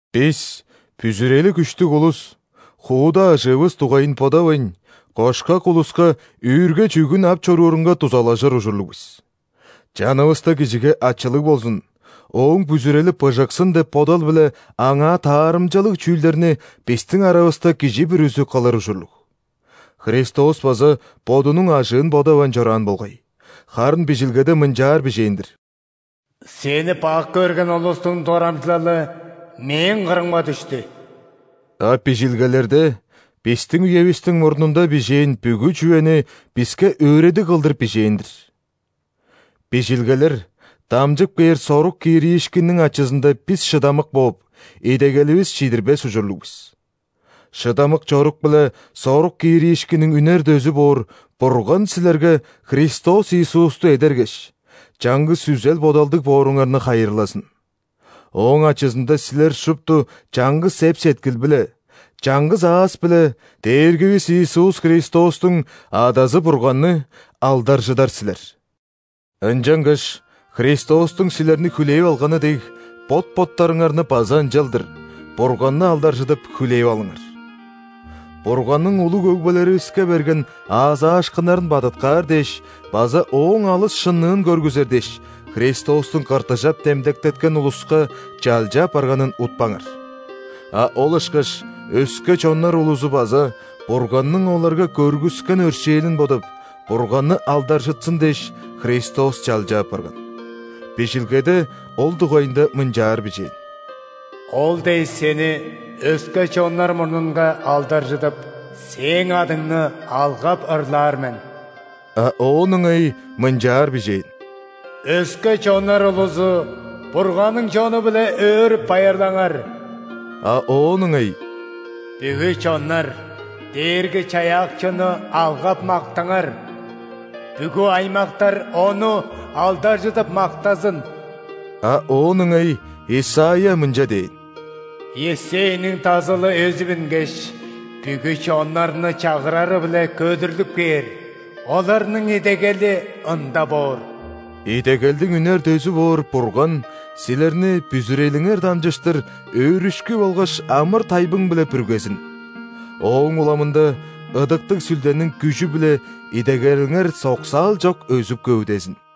Бис, бүзүрели күштүг улус, хууда ажыывыс дугайын бодавайн, кошкак улуска үүрге-чүъгүн ап чоруурунга дузалажыр ужурлуг бис. Чанывыста кижиге ачылыг болзун, ооң бүзүрели быжыксын деп бодал-биле аңаа таарымчалыг чүүлдерни бистиң аравыста кижи бүрүзү кылыр ужурлуг. Христос база Бодунуң ажыын бодавайн чораан болгай, харын Бижилгеде мынчаар бижээн-дир: «Сени бак көрген улустуң дорамчылалы Мээң кырымга дүштү». А Бижилгелерде бистиң үевистиң мурнунда бижээн бүгү чүвени биске өөредиг кылдыр бижээн-дир. Бижилгелер дамчып кээр сорук кириишкинниң ачызында бис шыдамык бооп, идегеливис чидирбес ужурлуг бис. Шыдамык чорук биле сорук кириишкинниң үнер дөзү боор Бурган силерге Христос Иисусту эдергеш, чаңгыс үзел-бодалдыг бооруңарны хайырлазын. Ооң ачызында силер шупту чаңгыс эп-сеткил-биле, чаңгыс аас-биле Дээргивис Иисус Христостуң Адазы Бурганны алдаржыдар силер. Ынчангаш Христостуң силерни хүлээп алганы дег, бот-боттарыңарны база ынчалдыр, Бурганны алдаржыдып, хүлээп алыңар. Бурганның улуг өгбелеривиске берген аазаашкыннарын бадыткаар дээш база Ооң алыс шынныын көргүзер дээш, Христостуң ·кыртыжап демдектеткен улуска чалча апарганын утпаңар. А ол ышкаш өске чоннар улузу база Бурганның оларга көргүскен өршээлин бодап, Бурганны алдаржытсын дээш, Христос чалча апарган. Бижилгеде ол дугайында мынчаар бижээн:«Ол дээш, Сени өске чоннар мурнунга алдаржыдып,Сээң адыңны алгап ырлаар мен». А оон ыңай мынчаар бижээн:«Өске чоннар улузу, Бурганның чону-биле өөрүп-байырлаңар!» А оон ыңай:«Бүгү чоннар, Дээрги-Чаяакчыны алгап-мактаңар!Бүгү аймактар Ону алдаржыдып мактазын!» А оон ыңай Исайя мынча дээн:«Иессейниң Дазылы өзүп үнгеш,бүгү чоннарны чагырары-биле көдүрлүп кээр,оларның идегели Ында боор». Идегелдиң үнер дөзү боор Бурган силерни бүзүрелиңер дамчыштыр өөрүшкү болгаш амыр-тайбың-биле бүргезин, ооң уламында Ыдыктыг Сүлдениң күжү-биле идегелиңер соксаал чок өзүп-көвүдезин.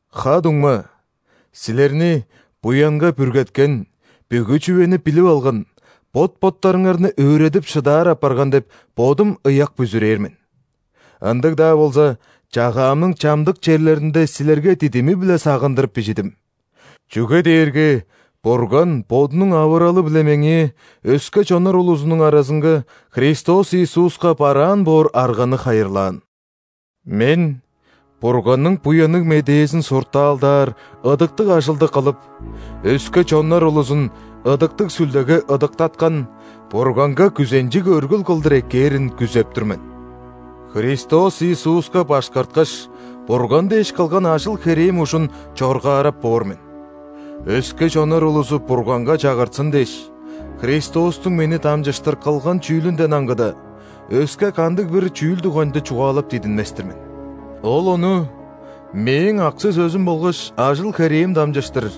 Ха-дуңма, силерни буянга бүргеткен, бүгү чүвени билип алган, бот-боттарыңарны өөредип шыдаар апарган деп, бодум ыяк бүзүрээр мен. Ындыг-даа болза, чагаамның чамдык черлеринде силерге дидими-биле сагындырып бижидим. Чүге дээрге Бурган Бодунуң авыралы-биле меңээ өске чоннар улузунуң аразынга Христос Иисуска бараан боор арганы хайырлаан. Мен Бурганның Буянныг Медээзин суртаалдаар ыдыктыг ажылды кылып, өске чоннар улузун Ыдыктыг Сүлдеге ыдыктаткан, Бурганга күзенчиг өргүл кылдыр эккээрин күзеп тур мен. Христос Иисуска башкарткаш, Бурган дээш кылган ажыл-херээм ужун чоргаарап боор мен. Өске чоннар улузу Бурганга чагыртсын дээш, Христостуң мени дамчыштыр кылган чүүлүнден аңгыда, өске кандыг-бир чүүл дугайында чугаалап дидинмес-тир мен. Ол ону мээң аксы-сөзүм болгаш ажыл-херээм дамчыштыр,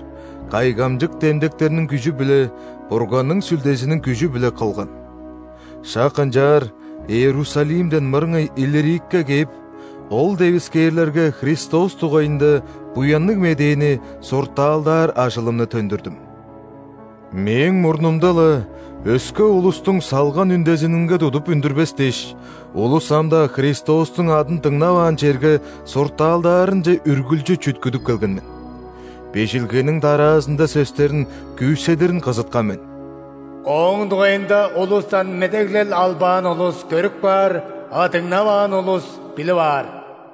кайгамчык демдектерниң күжү-биле, Бурганның Сүлдезиниң күжү-биле кылган. Шак ынчаар Иерусалимден мырыңай Иллирикке кээп, ол девискээрлерге Христос дугайында Буянныг Медээни суртаалдаар ажылымны төндүрдүм. Мээң мурнумда-ла өске улустуң салган үндезининге тудуп үндүрбес дээш, улус ам-даа Христостуң адын дыңнаваан черге суртаалдаарынче үргүлчү чүткүдүп келген мен. Бижилгениң дараазында сөстерин күүседирин кызыткан мен:«Ооң дугайында улустан медеглел албаан улус – көрүп каар,а дыңнаваан улус – билип аар».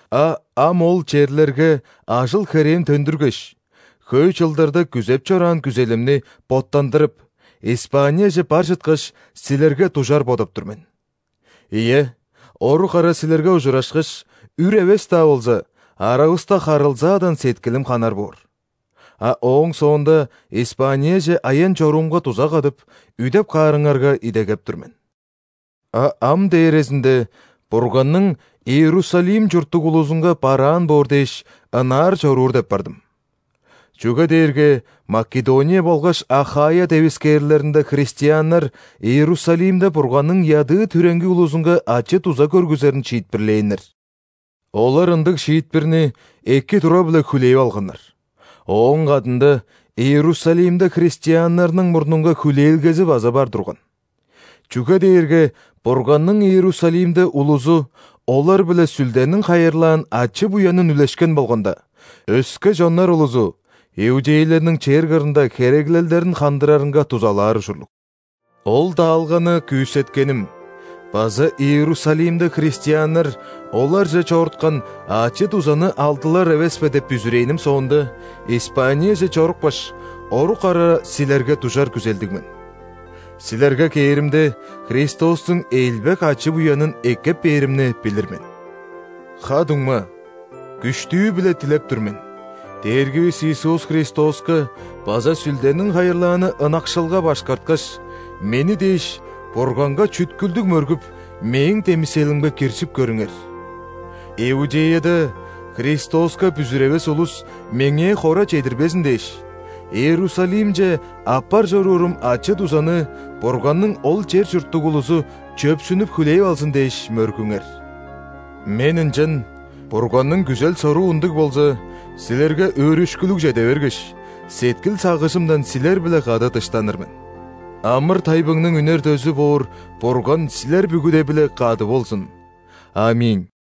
А ам ол черлерге ажыл-херээм төндүргеш, хөй чылдарда күзеп чораан күзелимни боттандырып, Испанияже бар чыткаш, силерге дужар бодап тур мен. Ийе, орук ара силерге ужурашкаш, үр эвес-даа болза, аравыста харылзаадан сеткилим ханар боор. А ооң соонда Испанияже аян-чоруумга дуза кадып, үдеп каарыңарга идегеп тур мен. А ам дээрезинде Бурганның Иерусалим чурттуг улузунга бараан боор дээш, ынаар чоруур деп бардым. Чүге дээрге Македония болгаш Ахайя девискээрлеринде христианнар Иерусалимде Бурганның ядыы-түреңги улузунга ачы-дуза көргүзерин шиитпирлээннер. Олар ындыг шиитпирни эки тура-биле хүлээп алганнар, ооң кадында Иерусалимде христианнарның мурнунга хүлээлгези база бар турган. Чүге дээрге Бурганның Иерусалимде улузу олар-биле Сүлдениң хайырлаан ачы-буянын үлешкен болганда, өске чоннар улузу иудейлерниң чер кырында хереглелдерин хандырарынга дузалаар ужурлуг. Ол даалганы күүсеткеним база Иерусалимде христианнар оларже чоруткан ачы-дузаны алдылар эвеспе деп бүзүрээним соонда, Испанияже чорупкаш, орук ара силерге дужар күзелдиг мен. Силерге кээримде, Христостуң элбек ачы-буянын эккеп бээримни билир мен. Ха-дуңма, күштүү-биле дилеп тур мен: Дээргивис Иисус Христоска база Сүлдениң хайырлааны ынакшылга башкарткаш, мени дээш Бурганга чүткүлдүг мөргүп, мээң демиселимге киржип көрүңер. Иудеяда Христоска бүзүревес улус меңээ хора чедирбезин дээш, Иерусалимче аппар чоруурум ачы-дузаны Бурганның ол чер чурттуг улузу чөпсүнүп хүлээп алзын дээш мөргүңер. Мен ынчан Бурганның күзел-соруу ындыг болза, силерге өөрүшкүлүг чеде бергеш, сеткил-сагыжымдан силер-биле кады дыштаныр мен. Амыр-тайбыңның үнер дөзү боор Бурган силер бүгүде-биле кады болзун. ·Аминь.